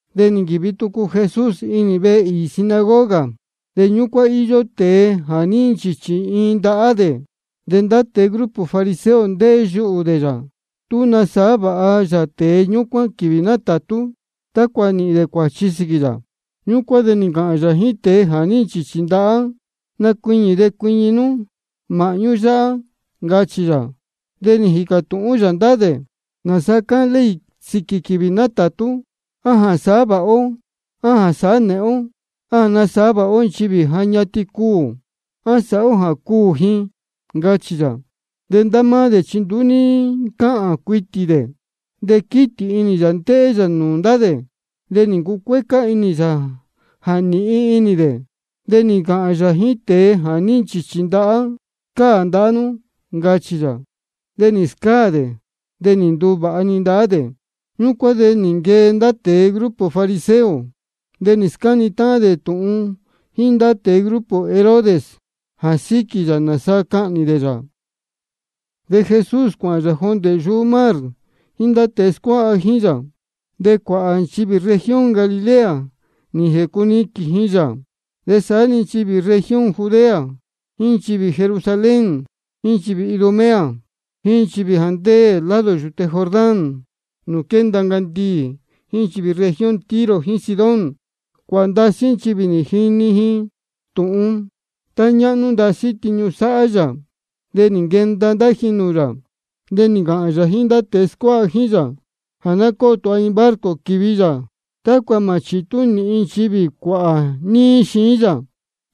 De nī nquīvi tucu Jesús inī iin vehe īī sinagoga. De ñúcuán íyó iin tēe jā ní nchīchī iin ndahá dē. De ndá tēe grupo fariseo ndéhé yuhū dē yā, tú nasāhá vāha yā tēe ñúcuán quīvī nátātú, tácua nīhīn dē cuāchi sīquī yā. Ñúcuán de nī ncāhān yā jíín tēe jā ní nchīchī ndahá: Nacuiñī de cuiñi nú māhñú yáhá, ncachī yā. De nī jīcā tūhún yā ndá dē: ¿Nāsa cáhān ley sīquī quīvī nátātú? ¿A jā sāhá vāha ó, á jā sāhá nēhén ó? ¿A jā nasāhá vāha ó nchivī ja ñatin cuū, á sāhá ó jā cuū ji? ncachī yā. De ndá máá dē chi nduú ní ncáhān cuitī dē. De quítī inī yā ndéhé yā nūū ndá dē, de nī ncucuécá inī yā jā nīhin inī dē. De nī ncāhān yā jíín tēe jā ní nchīchī ndahá: Scáā ndahá nú, ncachī yā. De nī scáā dē, de nī nduvāha-ni ndahá dē. Ñúcuán de nī nquee ndá tēe grupo fariseo, de nī scáni táhán dē tūhun jíín ndá tēe grupo Herodes jā síquī yā, nāsa cahnī dē yā. De Jesús cuāhān yā jondē yuhú mar jíín ndá tēe scuáha jíín yā. De cuāhā nchivī región Galilea nī jēcuniquīn ji yā. De saá-ni nchivī región Judea, jíín nchivī Jerusalén, jíín nchivī Idumea, jíín nchivī jā ndéē lado yūte Jordán nūū quénda ncandiī, jíín nchivī región Tiro jíín Sidón, cuāhā ndasí nchivī nī jini ji tūhun tá ñáhnú ndasí tiñu sáhá yā, de nī nquenda ndá ji nūū yā. De nī ncāhān yā jíín ndá tēe scuáha jíín yā jā ná cóo tūha iin barco quīvi yā, tácua mā chitú nīhin nchivī cuāhā níí xiín yā.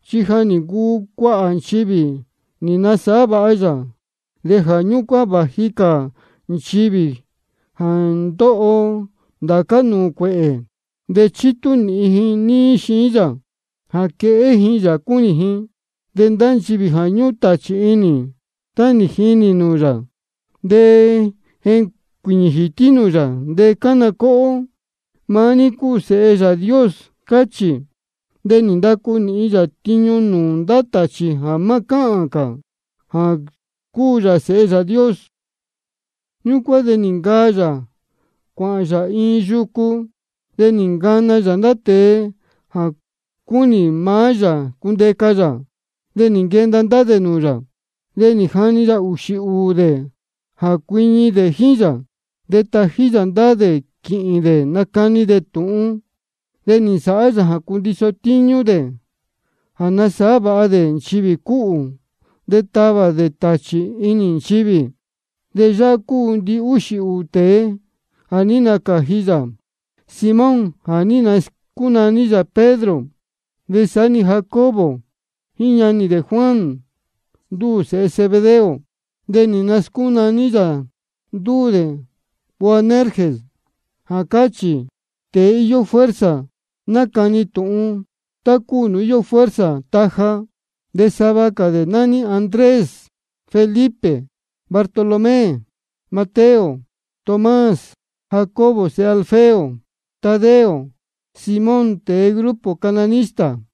Chi ja nī ncuu cuāhā nchivī nī nasāhá vāha yā, de jā ñúcuán vāji cuāhā cā nchivī jā ndóho ndācá nūū cuēhē, de chítú nīhin ji níí xiín yā jā quehé ji yā cúnī ji. De ndá nchivī jā ñúhún tāchī inī, tá nī jinī nūū yā, de jécuīñī jītí nūū yā, de cána cóhó: Maá ní cúu Sēhe Yāā Dios, cáchī. De nī ndacu nīhin yā nūū ndá tāchī jā má cáhān cā jā cúu yā Sēhe Yāā Dios. Ñúcuán de nī ncaa yā cuāhān yā iin yucu. De nī ncana yā ndá tēe jā cúnī maá yā cundeca yā, de nī nquenda ndá dē nūū yā. De nī jani yā ūxī ūū dē jā cuiñi dē jíín yā, de tají yā ndá dē quīhīn dē nacani dē tūhun. De nī nsāhá yā jā cundiso tíñú dē jā nasāhá vāha dē nchivī cúhū de tavā dē ndá tāchī inī nchivī. De yáhá cúu ndihúxī ūū tēe jā ní nacāji yā: Simón jā ní nascúnaní yā dē Pedro. De saá-ni Jacobo jíín ñanī dē Juan, ndúū sēhe Zebedeo. De nī nascúnaní yā ndúū dē Boanerges, jā cáchī: Tēe íyó fuerza nacani tūhun, tá cúu nūū íyó fuerza taja. De sava cā dē nání dē Andrés, Felipe, Bartolomé, Mateo, Tomás, Jacobo sēhe Alfeo, Tadeo, Simón tēe grupo cananista,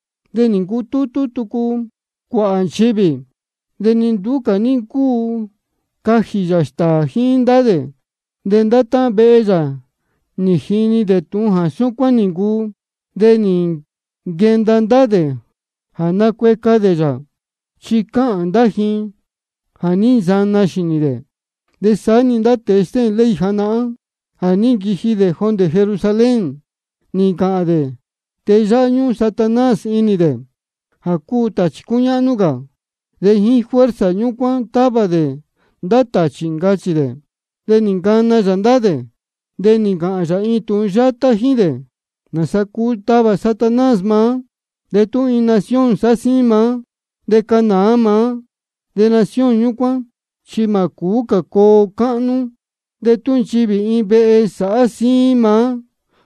De nī ncutútú tucu cuāhā nchivī, de ni nduú cā ní ncúu cajī yā stāā jíín ndá dē. De ndá táhán vehe yā nī jini tūhun jā súcuán cúu. De nī nquenda ndá dē jā nacueca dē yā, chi cáhān ndá jā ní nsana xīnī yā. De saá-ni ndá tēe stéhēn ley janahán jā ní nquiji jondē Jerusalén, nī ncāhān dē: Tēe yáhá ñúhún Satanás inī dē, jā cúu tāchī cúñáhnú cā. De jíín fuerza ñúcuán távā dē ndá tāchī, ncachī dē. De nī ncana yā ndá dē, de nī ncāhān yā iin tūhun yátá jíín dē: ¿Nāsa cuu tavā Satanás maá? De tú iin nación sáhá síín maá de cánāá maá, de nación ñúcuán chi mā cūú cā coo cáhnú. De tú nchivī iin vehe sáhá síín maá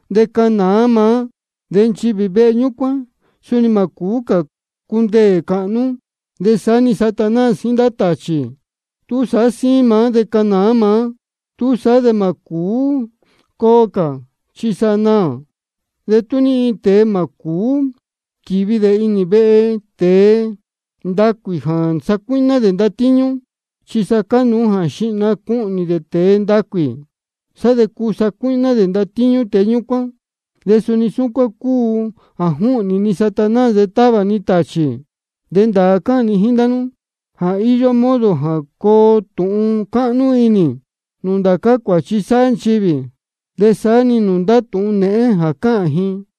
de cánāá maá, de nchivī vehe ñúcuán suni mā cūú cā cundeē cāhnú. De saá-ni Satanás jíín ndá táhán tāchī, tú sáhá síín maá de cánāá maá, túsaá de mā cūú coo cā, chi sa naā. De ni iin tēe mā cūú quīvi dē inī vehe tēe ndacuī jā sacuíhná dē ndatíñú, chi cánuú jā xihna cuhnī dē tēe ndacuī, sá de cuu sacuíhná dē ndatíñú tēe ñúcuán. De suni súcuán cúu jā júhnī ni Satanás de távā ni tāchī. De ndāā cáhān ni jíín ndá nú jā íyó modo jā coo tūhun cáhnú inī nūū ndācá cuāchi sáhá nchivī, de saá-ni nūū ndá tūhun nēhén jā cáhān ji.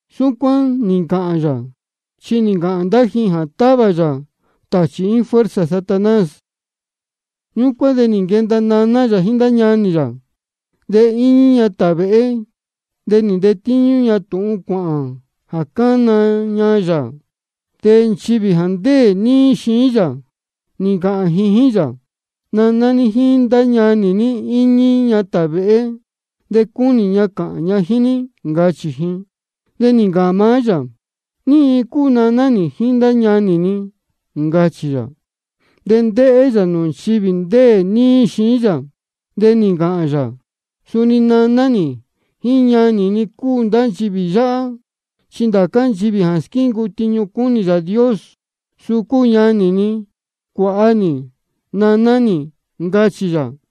Súcuán nī ncāhān yā, chi nī ncāhān ndá ji jā távā yā tāchī jíín fuerza Satanás. Ñúcuán de nī nquenda naná yā jíín ndá ñanī yā. De íñí ña tāvēhé, de nī ntetíñú ña tūhun cuāhān jā cána ña yā. De nchivī jā ndéē níí xiín yā, nī ncāhān ji jíín yā: Naná ní jíín ndá ñanī ní íñí ña tāvēhé, de cúnī ña cāhān ña jíín ní, ncachī ji. De nī ncāhān maá yā: ¿Ní iin cúu naná nī jíín ndá ñanī ni? ncachī yā. De ndéhé yā nūū nchivī ndéē níí xiín yā, de nī ncāhān yā: Suni naná nī jíín ñanī ni cúu ndá nchivī yáhá. Chi ndācá nchivī jā squíncuu tiñu cúnī Yāā Dios, suu cúu ñanī ni, cuāha nī, naná nī, ncachī yā.